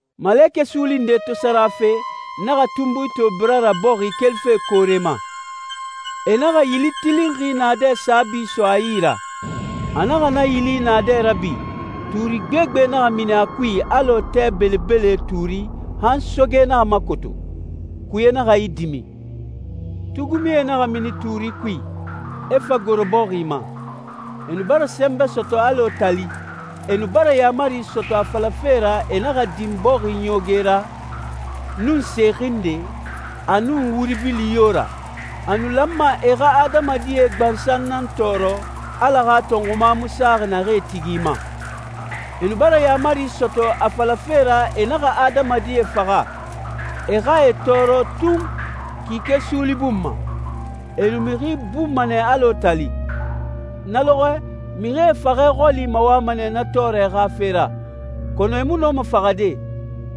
Malekɛ suuli nde to sara fe, n naxa tunbui to bira ra bɔxi kelife koore ma. E naxa yili tilinxi naadɛ saabi so a yi ra. A naxa na yili naadɛ rabi, tuuri gbegbe naxa mini a kui alɔ tɛ belebele tuuri han soge naxa makoto, kuye naxa idimi. Tugumie naxa mini tuuri kui, e fa goro bɔxi ma. E nu bara sɛnbɛ sɔtɔ alɔ tali. E nu bara yaamari sɔtɔ a falafe ra e naxa din bɔxi ɲooge ra, nun se xinde, a nun wuri bili yo ra. A nu lanma e xa adamadie gbansan nan tɔɔrɔ Ala xa tɔnxuma mu saxi naxee tigi ma. E nu bara yaamari sɔtɔ a falafe ra e naxa adamadie faxa, e xa e tɔɔrɔ tun kike suuli bun ma. E nu mixi bunma nɛ alɔ tali. Na lɔxɔɛe, mixie faxɛ xɔli mawama nɛ na tɔɔrɛ xa fe ra, kɔnɔ e mu nɔma faxade.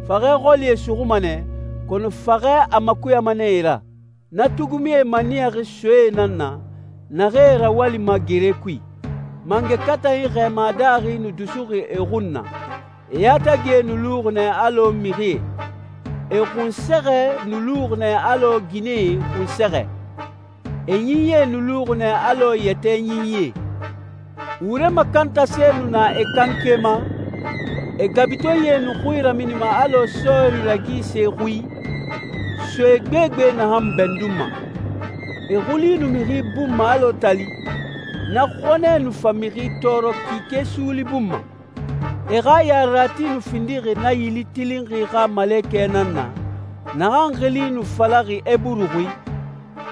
Faxɛ xɔli e suxuma nɛ, kɔnɔ faxɛ a makuyama nɛ e ra. Na tugumie maniyaxi soe nan na, naxee rawalima gere kui. Mangɛ katanyi xɛɛma daaxi nu dusuxi e xun na, e yatagie nu luxi nɛ alɔ mixie. E xunsɛxɛ nu luxi nɛ alɔ ginɛe xunsɛxɛ. E ɲinyie nu luxi nɛ alɔ yɛtɛ ɲinyie. Wure makantase nu na e kanke ma, e gabutenyie nu xui raminima alɔ sɔɔri ragise xui, soe gbegbe naxan bɛndunma. E xuli nu mixi bunma alɔ tali, na xɔnɛ nu fa mixi tɔɔrɔ kike suuli bun ma. E xa yarerati nu findixi na yili tilinxi xa malekɛ nan na, naxan xili nu falaxi Eburu xui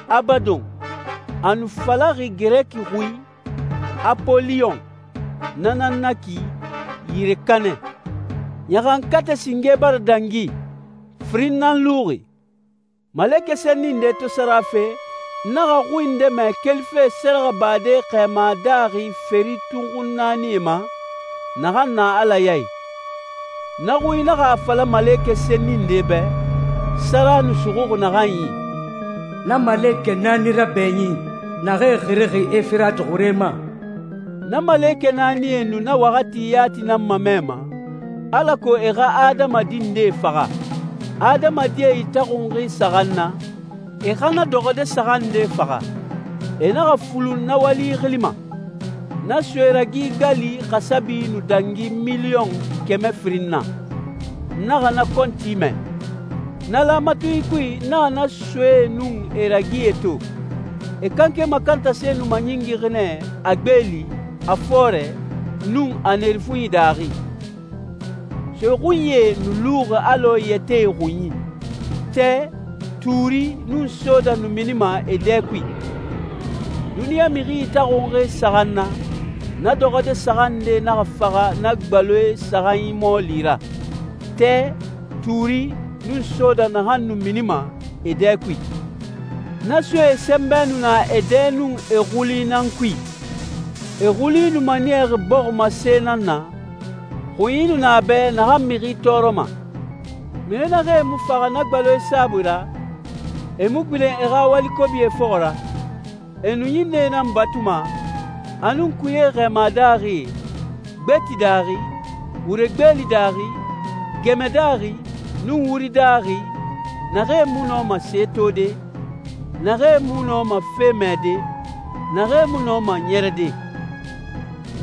«Abadon,» a nu falaxi Girɛki xui «Apoliyon,» na nan na ki «Yire Kanɛ.» Ɲaxankatɛ singe bara dangi, firin nan luxi. Malekɛ senni nde to sara fe, n naxa xui nde mɛ kelife sɛrɛxɛbade xɛɛma daaxi feri tunxun naanie ma, naxan na Ala ya i. Na xui naxa a fala malekɛ senni nde bɛ, sara nu suxuxi naxan yi, «Na malekɛ naani rabɛɲin, naxee xirixi Efirati xure ma.» Na malekɛ naanie nu na waxati yati nan mamɛma, alako e xa adamadi ndee faxa. Adamadie itaxunxi saxan na, e xa na dɔxɔde saxan nde faxa. E naxa fulun na wali xili ma. Na soe ragi gali xasabi nu dangi miliyɔn kɛmɛ firin na. N naxa na kɔnti mɛ. Na laamatunyi kui n naxa na soee nun e ragie to. E kanke makantase nu maɲingixi nɛ a gbeeli, a fɔɔrɛ, nun a nerefunyi daaxi. Soe xunyie nu luxi alɔ yɛtɛe xunyi. Tɛ, tuuri, nun soda nu minima e dɛ kui. Duniɲa mixi itaxunxi saxan na, na dɔxɔde saxan nde naxa faxa na gbaloe saxanyi mɔɔli ra: tɛ, tuuri, nun soda naxan nu minima e dɛ kui. Na soee sɛnbɛ nu na e dɛ nun e xuli nan kui. E xuli nu maniyaxi bɔximase nan na, xunyi nu na a bɛ naxan mixi tɔɔrɔma. Mixi naxee mu faxa na gbaloe saabui ra, e mu gbilen e xa wali kobie fɔxɔ ra. E nu ɲinnɛe nan batuma, a nun kuyee xɛɛma daaxi, gbeti daaxi, wure gbeeli daaxi, gɛmɛ daaxi, nun wuri daaxi, naxee mu nɔma se tode, naxee mu nɔma fe mɛde, naxee mu nɔma ɲɛrɛde.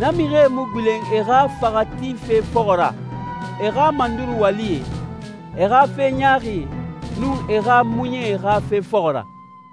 Na mixie mu gbilen e xa faxa tife fɔxɔ ra, e xa manduru walie, e xa fe ɲaaxie, nun e xa muɲɛe xa fe fɔxɔ ra.